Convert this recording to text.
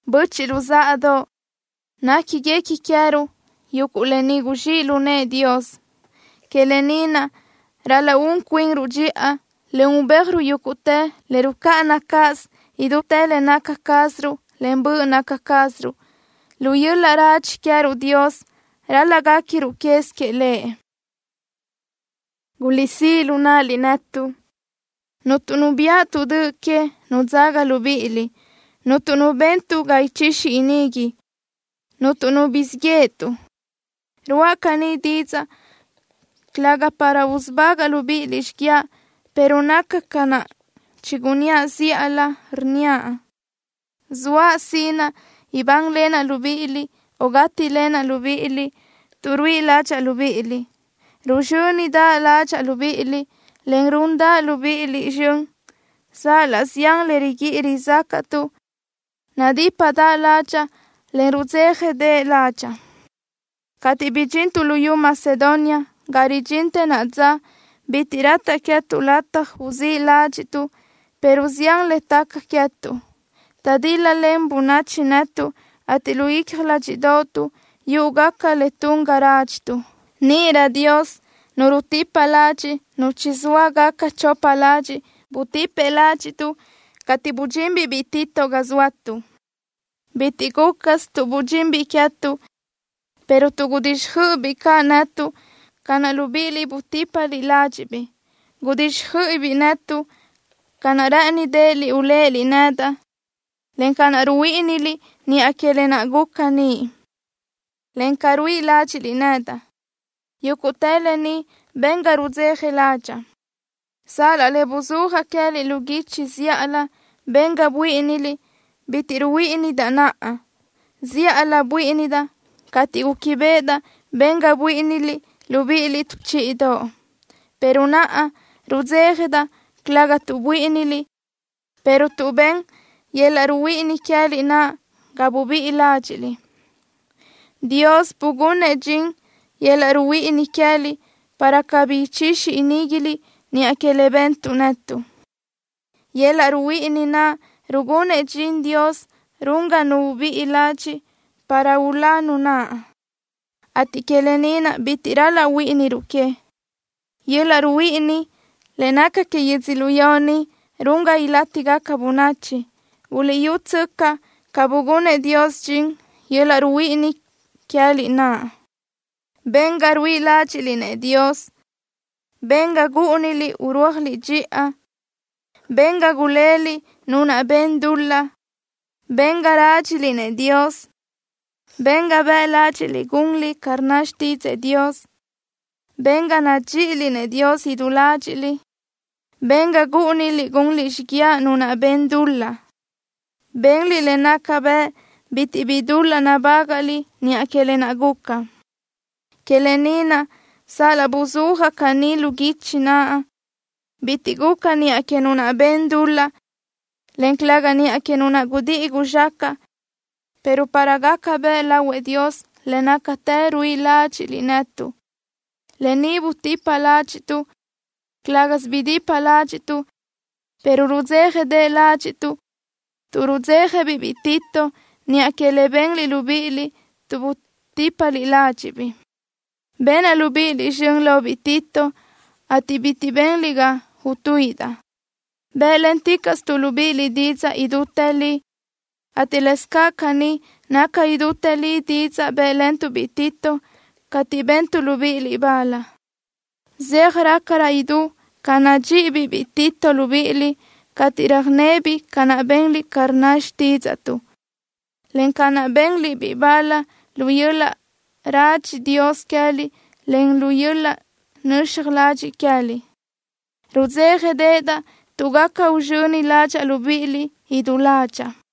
Böchiʼ luzáʼadoʼ, néquiguequi queë́ruʼ yuguʼ lë ni guzxíʼ lu nëʼë Dios. Que lë ni naʼ ral-laʼ un cuinruʼ dxiʼa, en ubéajruʼ yúguʼtë le rucáʼana cáʼasö idútë le naca cázaruʼ, en böʼ naca cázaruʼ. Lu yöl-laʼ radxi queë́ruʼ Dios ral-laʼ guéquiruʼ quez queëʼ Lëʼ. Guliʼsíʼ lu náʼaliʼ netuʼ. Cuntu nu biáʼatuʼ döʼ que, nu dzaga libíʼiliʼ. Cuntu nu bentuʼ ga ichixi inigui. Cuntu nu guzxíʼ yéʼetuʼ. Ruáʼa caní didzaʼ, calëga para usubágaʼa libíʼiliʼ xíguiaʼ, pero naca ca naʼ chigunníaʼ zíʼalö, rnníaʼ: Zoaʼ sinaʼ ibánlenaʼ libíʼiliʼ o gátilenaʼ libíʼiliʼ tuʼ ruíʼi ládxaʼa libíʼiliʼ. Ruzxö́nidaʼ ládxaʼa libíʼiliʼ, en rúndaʼa libíʼiliʼ zxön. Sal-laʼ zián le riguíʼi rizácaʼtuʼ, nadípadaʼ ládxaʼa, en rudzéjadeʼe ládxaʼa. Cateʼ bidxintuʼ luyú Macedonia, ga ridxintë naʼa dza, bitiʼ rataʼ queë́tuʼ lataj uzíʼ ládxiʼtuʼ, pero zián le taca queë́tuʼ. Taʼdíl-lalen bönachi netuʼ, ateʼ lu icja ládxiʼdoʼotuʼ yúʼugaca le tun ga rádxituʼ. Níʼirö Dios, Nu rutipa ladxiʼ nu chizóa gaca chopa ladxiʼ, butipëʼ ládxiʼtuʼ cateʼ budxinbiʼ biʼi Tito ga guzóatuʼ. Bitiʼ gúcasö tuʼ budxinbiʼ queë́tuʼ, pero tuʼ gudíxjöiʼibiʼ caʼ netuʼ ca naʼ libíʼiliʼ butípaliʼ ládxiʼbiʼ. Gudíxjöiʼibiʼ netuʼ ca naʼ rë́ʼënideʼeliʼ uléʼeliʼ nedaʼ, en ca naʼ ruhuíʼiniliʼ niʼa que lë naʼ guca niʼ, encaʼ ca ruíʼi ládxiʼliʼ nedaʼ. Yúguʼtë lë ni ben ga rudzeja ládxaʼa. Sal-laʼ le buzúajaʼ queë́liʼ lu guichi zíʼalö ben ga buíʼiniliʼ, bitiʼ ruhuíʼindaʼ naʼa. Zíʼalö buíʼinidaʼ cateʼ gúquibeʼedaʼ ben ga buíʼiniliʼ libíʼiliʼ tu chíʼidoʼ, pero naʼa rudzéjadaʼ, calëga tuʼ buíʼiniliʼ, pero tuʼ ben yöl-laʼ ruhuíʼini queë́liʼ naʼ ga bubíʼi ládxiʼliʼ. Dios bugunëʼ dxin yöl-laʼ ruhuíʼini queë́liʼ, para cabí ichixi iníguiliʼ niʼa que le bentuʼ netuʼ. Yöl-laʼ ruhuíʼini naʼ rugunëʼ dxin Dios run ga nu ubíʼi ladxiʼ para ulá nu naʼ, ateʼ que lë ni naʼ bitiʼ ral-laʼ huíʼiniruʼ que. Yöl-laʼ ruhuíʼini le naca que yödzölió ni run ga ilátigaca bönachi. Buliʼyútsöcaʼ ca bugunëʼ Dios dxin yöl-laʼ ruhuíʼini queë́liʼ naʼ. Ben ga ruíʼi ládxiʼliʼ-nëʼ Dios. Ben ga gúʼuniliʼ urúajliʼ dxiʼa. Ben ga guléliʼ nu naʼ ben dul-laʼ. Ben ga rádxiliʼ-nëʼ Dios. Ben ga bëʼ ládxiʼliʼ gunliʼ ca rnna xtídzëʼë Dios. Ben ga nadxíʼiliʼ-nëʼ Dios idú ládxiʼliʼ. Ben ga gúʼuniliʼ gunliʼ xíguiaʼ nu naʼ ben dul-laʼ. Benliʼ le naca bëʼ bitiʼ bi dul-laʼ nabágaʼliʼ niʼa que lë naʼ guca. Que lë ni naʼ, sal-laʼ buzúajaʼ caní lu guichi naʼ, bitiʼ guca niʼa que nu naʼ ben dul-laʼ, en calëga niʼa que nu naʼ gudíʼi guzxacaʼ, pero para gaca bëʼ lahuëʼ Dios le nácatë ruíʼi ládxiʼliʼ netuʼ. ¡Lë ni butipa ládxiʼtuʼ! Calë́gasö bidipa ládxiʼtuʼ, pero rudzéjadeʼe ládxiʼtuʼ tuʼ rudzéjabiʼ biʼi Tito niʼa que le benliʼ libíʼiliʼ, tuʼ butípaliʼ ládxiʼbiʼ. Benaʼ libíʼiliʼ zxön lobiʼ Tito, ateʼ bitiʼ benliʼ ga utuíʼidaʼ. Bë́ʼlenticaʼstuʼ libíʼiliʼ didzaʼ idútë li, ateʼ lëscaʼ caní naca idútë li didzaʼ bë́ʼlentuʼ-biʼ Tito cateʼ bentuʼ libíʼiliʼ bal. Zeaj rácarö idú ca nadxíʼibiʼ biʼi Tito libíʼiliʼ cateʼ röjnebiʼ ca naʼ benliʼ ca rnna xtídzaʼtuʼ, en ca naʼ benliʼ-biʼ bal lu yöl-laʼ radxi Dios queë́liʼ en lu yöl-laʼ nöxaj ladxiʼ queë́liʼ. Rudzéjadeʼedaʼ tuʼ gaca uzxöni ládxaʼa libíʼiliʼ idú ládxaʼa.